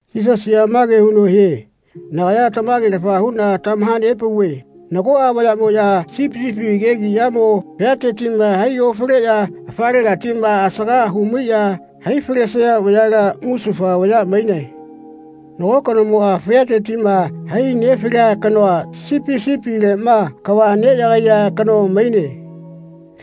Yisasiꞌa mage huno hie “Nagaya tamage-lafa huꞌna tamaha-nepauve nagoꞌa vayaꞌmoꞌya sipi sipi kegiꞌyamo fiatetiꞌma hai ofaleꞌya afalegatiꞌma asaga hu-maiꞌya hai falesaya vayala musufa vaya mainae. Nago kanomoꞌma fiatetiꞌma hai nefalea kanoa sipi sipileꞌma kava neꞌyagaiya kano maine.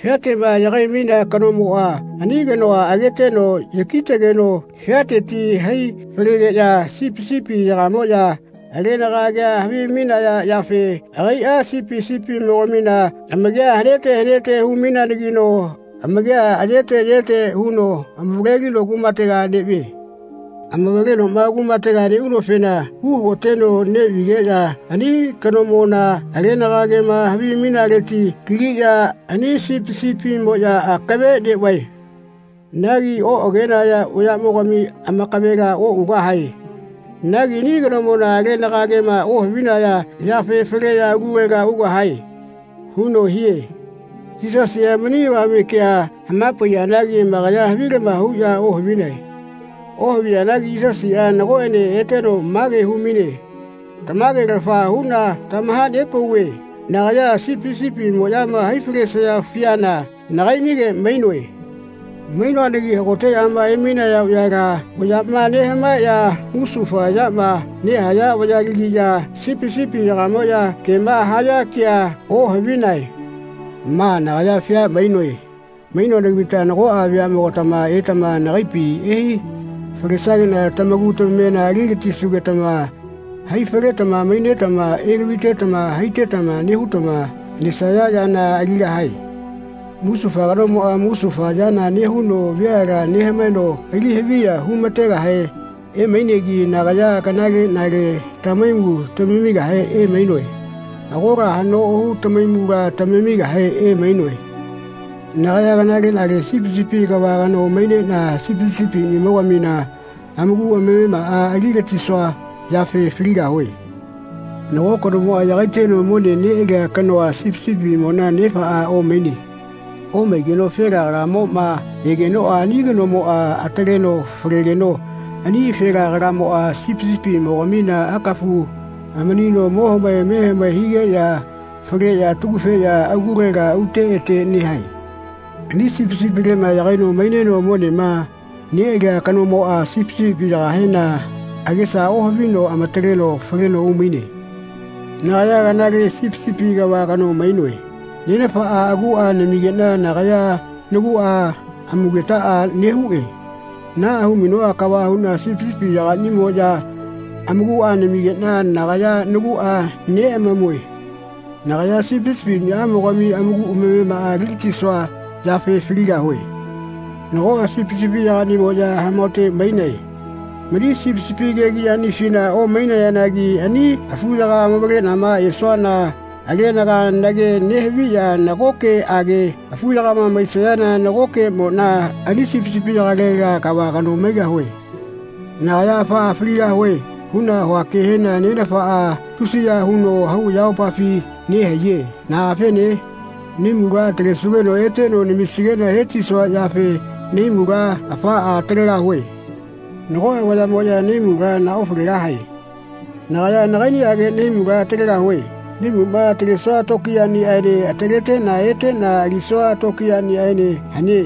Fiateꞌma yagai-mainea kanomoꞌa ani kanoa ageteno yaki-tegeno fiateti hai falegeꞌya sipi sipiyagamoꞌya alenaga agea havimainaya yafe agaiꞌa sipi sipimogamina amakia hanete hanete hu-maineanagino amakia ayete ayete huno amavaleno kumatega neꞌvie. Amavalenoꞌma kumatega neꞌunofena uhagoteno neꞌvigeꞌya ani kanomona alenaga agema havimainaleti lagiꞌya ani sipi sipimoꞌya akave neꞌvae. Nagi oꞌagenaya vayaꞌmogami amakavela oꞌugahae. Nagi ani kanomona alenaga agema ohavinaya yafe faleꞌya alulega ugahae.” huno hie. Yisasiꞌa mani avame kea hama-paiyanagi amakaya havilama huꞌya ohavinae. Ohaviyanagi Yisasiꞌa nagoꞌene eteno mage hu-maine “Tamage-lafa huꞌna tamaha-nepauve nagaya sipi sipimoꞌyama hai falesaya fiana nagaiꞌnige mainoe. Mainoanagi hagoteꞌyama emainaya vayala vayaꞌma nehamaeꞌya musufa yama nehaya vayalagiꞌya sipi sipiyagamoꞌya kema haya kea ohavinae. Ma nagaya fia mainoe. Mainoanagitama nagoꞌa veaꞌmogatama etama nagaipi ehai falesageꞌna tamaku tamamena ali-gatisugetama hai faletama mainetama elavitetama haitetama nehutama nesaya yana aligahae. Musufa kanomoꞌa musufa yana nehuno veala nehamaeno ali haviya hu-ma-tegahe neꞌeanagi nagaya kanaleꞌnale tamahaimu tamamigahe emainoe. Agola haꞌno ohu tamahaimula tamamigahe emainoe. Nagaya kanaleꞌnale sipi sipi kava kano maineꞌna sipi sipiꞌniꞌamogamina amaku amamemaꞌa ali-gatisua yafe faligahue. Nago kanomoꞌa yagaiteno mone neꞌalia kanoa sipi sipimona nefaꞌa omaine. Omaigeno afela kalamoꞌma egenoꞌa ani kanomoꞌa ataleno falegeno ani afela kalamoꞌa sipi sipimogamina akafu amanino mo hamae me hamae higeꞌya faleꞌya atagufeꞌya alulega ute ete nehae. Ani sipi sipileꞌma yagaino maineno monema neꞌalia kanomoꞌa sipi sipiyagahena agesa ohavino amataleno faleno umaine. Nagaya kanale sipi sipi kava kano mainoe. Nenafaꞌa aguꞌa namigeꞌna nagaya naguꞌa amugetaꞌa nehuꞌe. Naꞌa hu-mainoꞌa kava huꞌna sipi sipiyagaꞌnimoꞌya amakuꞌa namigeꞌna nagaya naguꞌa neꞌamamue. Nagaya sipi sipiꞌniꞌamogami amaku amamemaꞌa ali-gatisua yafe faligahue. Nagoꞌa sipi sipiyagaꞌniꞌa amahaote mainae. Mani sipi sipi kegiꞌyaꞌnifina omainayanagi ani afuyaga amavaleꞌnama esuana alenaga nage nehaviꞌya nagokeꞌage afuyakama maisayana nagokeꞌmoꞌna ani sipi sipiyagalela kava kano maigahue. Nagaya ‘Afaꞌa faligahue.’ huꞌna hua kehena Nenafaꞌa tusiya huno hau ayamopafi nehaiye. Naꞌafene? Nahaimula atalesugeno eteno namisigeꞌna he-tisuaꞌyafe nahaimula afaꞌa atalegahue. Nagoꞌa vayamoꞌya nahaimula naha-ofalegahae. Nagaya nagaiꞌniꞌage nahaimula atalegahue. Nahaimuꞌma atalesua tokiyaꞌniꞌaene ataleteꞌna eteꞌna alisua tokiyaꞌniꞌaene hane.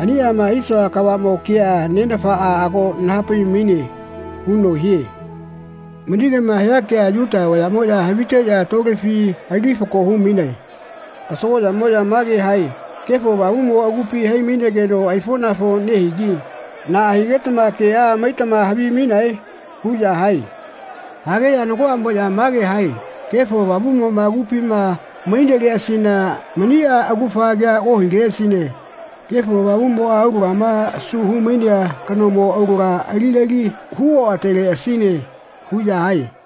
Aniꞌama hisua kavaꞌmo kea Nenafaꞌa ago naha-pai-maine.” huno hie. Mani kema hia kea Yuta vayaꞌmoꞌya haviteꞌya tolefi ali fako hu-mainae. Kasagoꞌyamoꞌya mage hae “Kefo Avamuꞌmo agupi hai-mainegeno aifoꞌnafo nehigi naꞌa higetama keꞌa maitama havimainae?” huꞌya hae. Hageꞌya nagoꞌamoꞌya mage hae “Kefo Avamuꞌmoꞌa agupima maineleꞌasina maniꞌa augafa kea ohileꞌasine. Kefo Avamuꞌmoꞌa aulagama asu hu-mainea kanomo aulaga aligali hu-oꞌateleꞌasine.” huꞌya hae.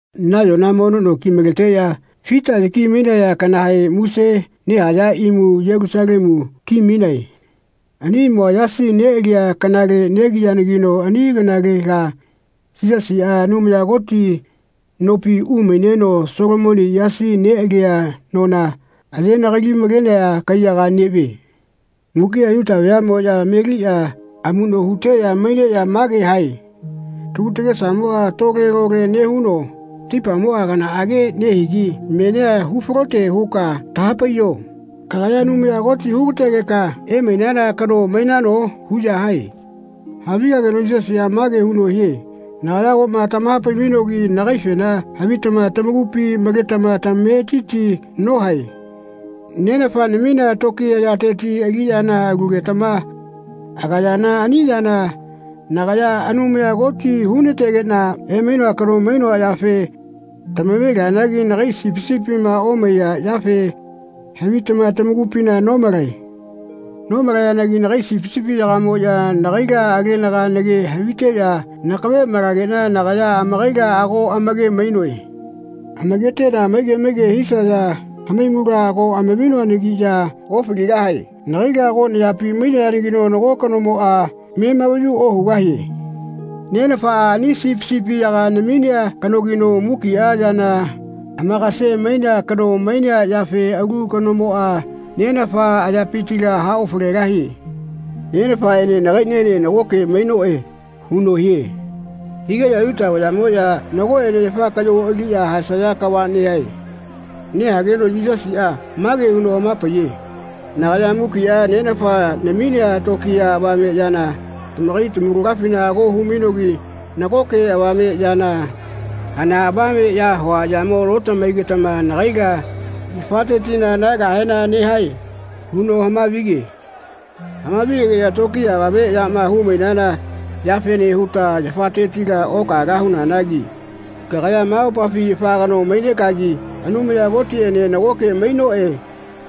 Nayona mono no kimaleteꞌya fita yaki-mainaya kanahe muse nehaya imu Yelusalemu ki-mainae. Ani imua yasi neꞌalia kanale negiyanagino ani kanalela Yisasiꞌa Anumaya Koti nopi umaineno Solomoni yasi neꞌalea nona aye-nagali-malenea kaiyaga neꞌvie. Mukiꞌa Yuta veaꞌmoꞌya meliꞌya amuꞌno huteꞌya maineꞌya mage hae “Tagu tagesamoꞌa tole-lole nehuno taipamoꞌa kanaꞌage nehigi. Menia hu-falote huka taha-paiyo kagaya Anumaya Koti hu-ga-tegeka emainana kano mainano?” huꞌya hae. Havigageno Yisasiꞌa mage huno hie “Nagaya agoꞌma tamaha-pai-mainogi nagaifena havitama tamakupi maletama tamametiti nohae. Nenafa naminea tokiya yateti aliꞌyana alugetama agayana ani yana nagaya Anumaya Koti hu-na-tegeꞌna emainoa kano mainoa yafe tama-ve-lianagi nagai sipi sipima omaiya yafe havitama tamakupina nomalae. Nomalayanagi nagai sipi sipiyagamoꞌya nagaila alenaga mage haviteꞌya nakave malageꞌna nagaya amakaila ago amake-mainoe. Amaketeꞌna maige maige hisaya hamaimula ago amaminoanagiꞌya ofaligahae. Nagaila ago nayapi mainayanagino nago kanomoꞌa memavayu ohugahie. Nenafaꞌa ani sipi sipiyaga naminea kanogino mukiꞌa yana amakase-mainea kano mainea yafe alu kanomoꞌa Nenafa ayapitila haofalegahie. Nenafaꞌene nagaiꞌniene nagoke mainoꞌe.” huno hie. Higeꞌya Yuta vayaꞌmoꞌya nagoꞌene yafa kaꞌyo aliꞌya haesaya kava nehae. Nehageno Yisasiꞌa mage huno hama-paiye “Nagaya mukiꞌa Nenafa naminea tokiya avame yana tamakai tamaulagafina ago hu-mainogi nagoke avameꞌyana hana avameꞌya hua yamo notamahaigetama nagaila yafatetila nahaegahena nehae?” huno hama-vige. Hama-vi-gegeꞌya “Tokiya avame yama hu-mainana yafene huta yafatetila okahaegahunagi kagaya ma mopafi afa kano mainekagi ‘Anumaya Kotiꞌene nagoke mainoꞌe.’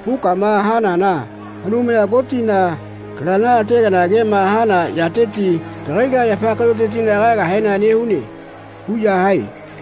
hukama hanana Anumaya Kotina kalana ategana kema hana yateti kagaila yafa kaꞌyotetila kahaegahena nehune.” huꞌya hae.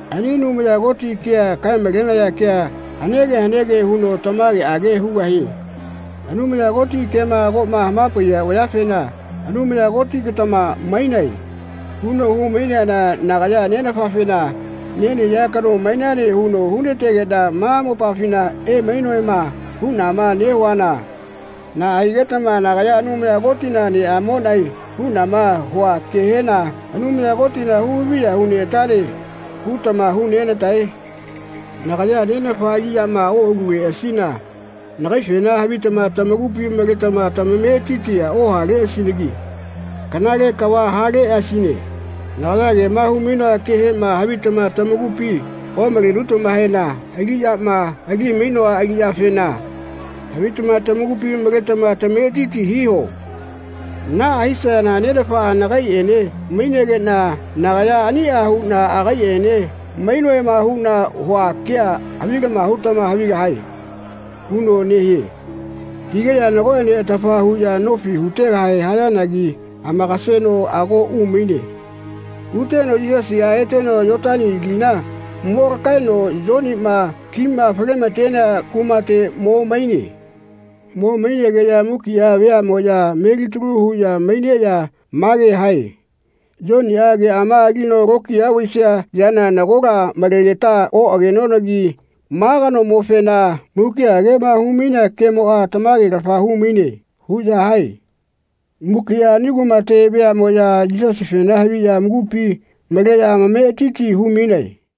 Ani Anumaya Koti kea kae-malenaya ke hanege hanege huno tamageꞌage hugahie. Anumaya Koti kema agoꞌma hama-paiya vayafena “Anumaya Kotigatama mainae.” huno hu-maineana nagaya Nenafafena “Nenahaiya kano mainane huno hu-na-tegeꞌna ma mopafina emainoema.” huꞌna nehuana naꞌa higetama “Nagaya Anumaya Kotina neꞌamoꞌnae.” huꞌnama hua kehena “Anumaya Kotina hu-haviya hu-neꞌatane.” hutama hu-nena-tae? “Nagaya Nenafa aliꞌyama oꞌaluleꞌasina nagaifena havitama tamakupi maletama tamametiti ohaleꞌasinagi kanale kava haleꞌasine. Nagaya kema hu-mainoa kehema havitama tamakupima omalenutamahena aliꞌyama ali-mainoa aliꞌyafena havitama tamakupi maletama tamametiti hiho. Naꞌa hisayana Nenafaꞌa nagaiꞌene maigeꞌna nagaya aniꞌa huꞌna agaiꞌene mainoꞌema huꞌna hua kea havilama hutama havigahae.” huno nehie. Higeꞌya nagoꞌene atafa huꞌya nofi hu-tegahe hayanagi amakaseno ago umaine. Uteno Yisasiꞌa eteno Yotani lina mo lakaeno Yoniꞌma lima fale-ma-tenea kumate mo maine. Mo mainegeꞌya mukiꞌa veaꞌmoꞌya melitalu huꞌya maineꞌya mage hae “Yoniꞌa keꞌama alino lokiya vaisia yana nagola malegeta oꞌagenonagi ma kanomofena mukiꞌa kema hu-mainea kemoꞌa tamage-lafa hu-maine.” huꞌya hae. Mukiꞌa ani kumate veaꞌmoꞌya Yisasifena haviꞌya amakupi maleꞌya amametiti hu-mainae.